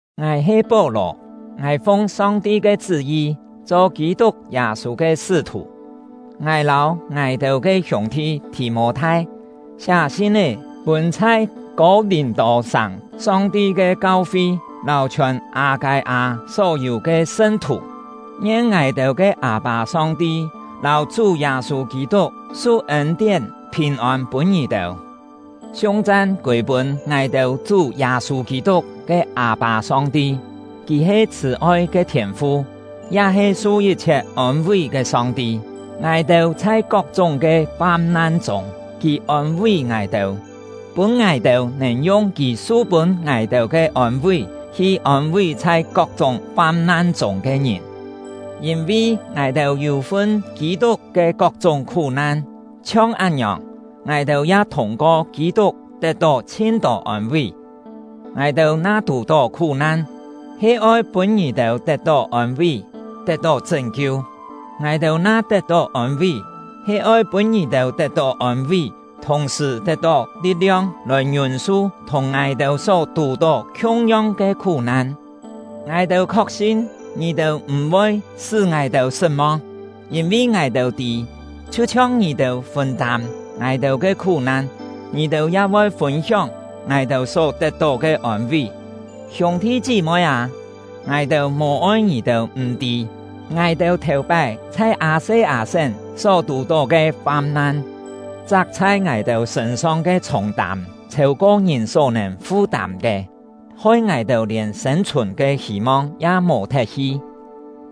Ngài he Pó-lò; ngài fung Song-ti ke chṳ́-yi cho Kî-tuk Yâ-sû ke sṳ́-thù. Ngài lâu ngài-têu ke hiûng-thi Thì-mô-thai siá sin-é pûn chhai Kô-lìm-tô-sàng Song-ti ke kau-fi lâu chhiòn Â-kâi-â só-yû ke sṳn-thù. Ngien ngài-têu ke Â-pâ Song-ti lâu Chú Yâ-sû Kî-tuk su ên-tién, phìn-ôn pûn ngì-têu. Siung-chan kûi-pûn ngài-têu Chú Yâ-sû Kî-tuk ke Â-pâ Song-ti! Kì he chhṳ̀-oi ke Thiên-fu, ya he su yit-chhiet ôn-ví ke Song-ti. Ngài-têu chhai kok-chúng ke fam-nan chûng, Kì ôn-ví ngài-têu, pûn ngài-têu nèn yung Kì su pûn ngài-têu ke ôn-ví hi ôn-ví chhai kok-chúng fam-nan chûng ke ngìn. Yîn-vi ngài-têu yû-fun Kî-tuk ke kok-chúng khú-nan, chhiong án-ngiòng, ngài-têu ya thûng-ko Kî-tuk tet-tó chhin-tô ôn-ví. Ngài-têu na tù-tó khú-nan, he oi pûn ngì-têu tet-tó ôn-ví, tet-tó chṳ́n-kiu; ngài-têu na tet-tó ôn-ví, he oi pûn ngì-têu tet-tó ôn-ví, thùng-sṳ̀ tet-tó li̍t-liong lòi ngiûn-su thùng ngài-têu só tù-tó khiung-yong ke khú-nan. Ngài-têu khok-sin ngì-têu m̀-voi sṳ́ ngài-têu sṳt-mong; yîn-vi ngài-têu tî, chhiu-chhiong ngì-têu fûn-tâm ngài-têu ke khú-nan, ngì-têu ya voi fûn-hióng ngài-têu só tet-tó ke ôn-ví. Hiûng-thi chí-moi â, ngài-têu mò-oi ngì-têu m̀-tî, ngài-têu thèu-pái chhai Â-se-â-sén só tù-tó ke fam-nan. Chak chhai ngài-têu sṳ̂n-song ke chhûng-tâm chhêu-ko ngìn só-nèn fu-tâm ke, hoi ngài-têu lièn sên-chhùn ke hî-mong ya mò-thet hi;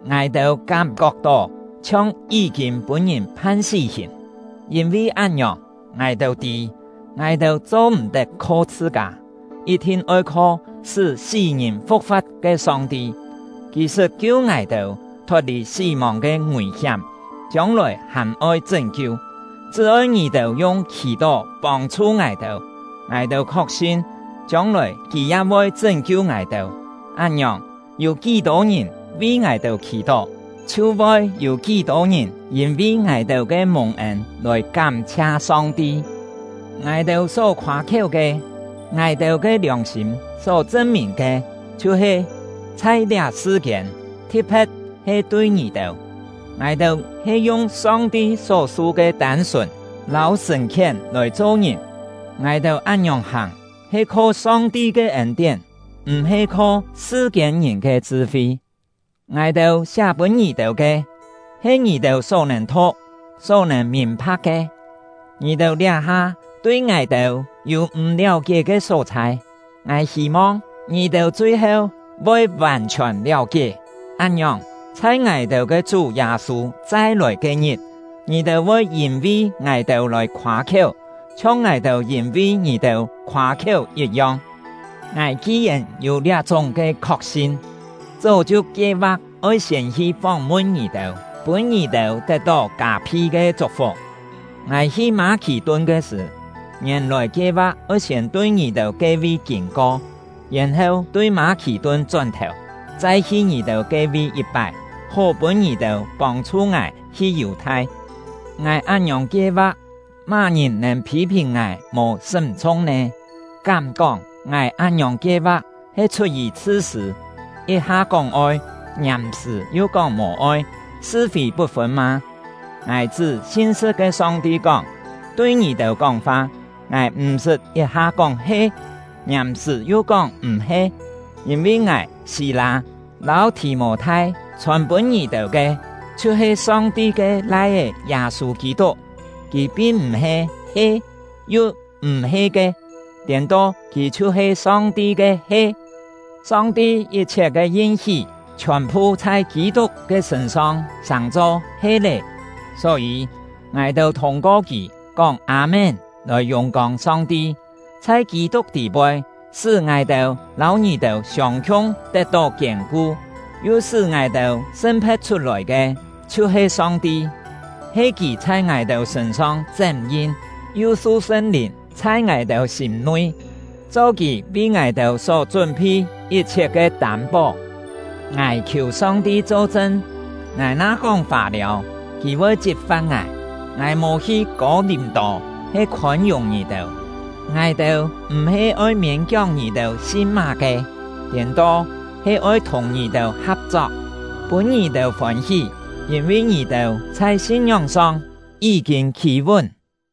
ngài-têu kám-kok-tó chhiong yí-kîn pûn-ngìn phan sí-hìn. Yîn-vi án-ngiòng, ngài-têu tî, ngài-têu cho-m̀-tet kho chhṳ-kâ, yit-thin oi kho sṳ́ sí-ngìn fu̍k-fa̍t ke Song-ti. Kì sṳt kiu ngài-têu thot-lì sí-mòng ke ngùi-hiám, chiông-lòi hàn-oi chṳ́n-kiu; chṳ́ oi ngì-têu yung khì-tó pông-chhu ngài-têu, ngài-têu khok-sin, chiông-lòi Kì ya voi chṳ́n-kiu ngài-têu. Án-ngiòng, yû kí-tô ngìn vi ngài-têu khì-tó, chhiu voi yû kí-tô ngìn yîn-vi ngài-têu ke mùng-ên lòi kám-chhia Song-ti. Ngài-têu só khoâ-khiéu ke, ngài-têu ke liòng-sîm só chṳn-mìn ke chhiu-he: Chhai liá sṳ-kiên, thi̍t-phe̍t he tui ngì-têu, ngài-têu he yung Song-ti só-su ke tân-sùn “tân-sùn” yû-têu kú-kién he “sṳn-kiet”. lâu sṳ̀n-khién lòi cho-ngìn; ngài-têu án-ngiòng hàng he kho Song-ti ke ên-tién, m̀-he kho sṳ-kiên-ngìn ke chṳ-fi. Ngài-têu siá pûn ngì-têu ke, he ngì-têu só nèn thu̍k, só nèn mìn-pha̍k ke. Ngì-têu liá-ha tui ngài-têu yû m̀ liáu-kié ke só-chhai, ngài hî-mong ngì-têu chui-heu voi vàn-chhiòn liáu-kié. Án-ngiòng, chhai ngài-têu ke Chú Yâ-sû chai-lòi ke-ngit, ngì-têu voi yîn-vi ngài-têu lòi khoâ-khiéu, chhiong ngài-têu yîn-vi ngì-têu khoâ-khiéu yit-yong. Ngài ki-yèn yû liá-chúng ke khok-sin, chó chhiu kie-va̍k oi siên hi fóng-mun ngì-têu, pûn ngì-têu tet-tó kâ-phi ke chuk-fuk. Ngài hi Mâ-khì-tun ke sṳ̀, ngièn-lòi kie-va̍k oi siên tui ngì-têu ke-vi kîn-ko, yèn-heu tui Mâ-khì-tun chón-thèu, chai hi ngì-têu ke-vi yit-pái, hó pûn ngì-têu pông-chhu ngài hi Yù-thai. Ngài án-ngiòng kie-va̍k, má-ngìn nèn phî-phìn ngài mò sṳ́m-chhung nè? Kám-kóng ngài án-ngiòng kie-va̍k he chhut-yì chhṳ-sṳ̂, yit-ha kóng oi, ngiàm-sṳ̀ yu kóng mò-oi, sṳ-fî put-fûn mâ? Ngài chṳ́ sin-sṳ̍t ke Song-ti kóng, tui ngì-têu kóng-fa, ngài m̀-sṳt yit-ha kóng “He”, ngiàm-sṳ̀ yu kóng “M̀-he”. Yîn-vi ngài, Sî-lâ, lâu Thì-mô-thai chhòn-pûn ngì-têu ke, chhiu-he Song-ti ke Lai-é Yâ-sû Kî-tuk, kì pin m̀-he “He” yu “M̀-he” ke; tiên-to, kì chhiu-he Song-ti ke “He”. Song-ti yit-chhiet ke yin-hí chhiòn-phu chhai Kî-tuk ke sṳ̂n-song sàng-cho “He” lé. Só-yî, ngài-têu thûng-ko kì kóng “Â-mén” lòi yùng-kông Song-ti. Chhai Kî-tuk tî-poi sṳ́ ngài-têu lâu ngì-têu siông-khiung tet-tó kiên-ku, yu sṳ́ ngài-têu sṳn-phe̍t chhut-lòi ke, chhiu-he Song-ti. He Kì chhai ngài-têu sṳ̂n-song chém-yin, yu su Sṳn-Lìn chhai ngài-têu sîm-nui, cho Kì vi ngài-têu só chún-phi yit-chhiet ke tâm-pó. Ngài khiù Song-ti cho-chṳn; ngài na kóng fâ-liâu, Kì voi chit-fa̍t ngài! Ngài mò hi Kô-lìm-tô he khôn-yùng ngì-têu. Ngài-têu m̀-he oi miên-kióng ngì-têu sin má-ke; tiên-to, he oi thùng ngì-têu ha̍p-chok, pûn ngì-têu fôn-hí, yîn-vi ngì-têu chhai sin-ngióng-song yí-kîn khî-vún.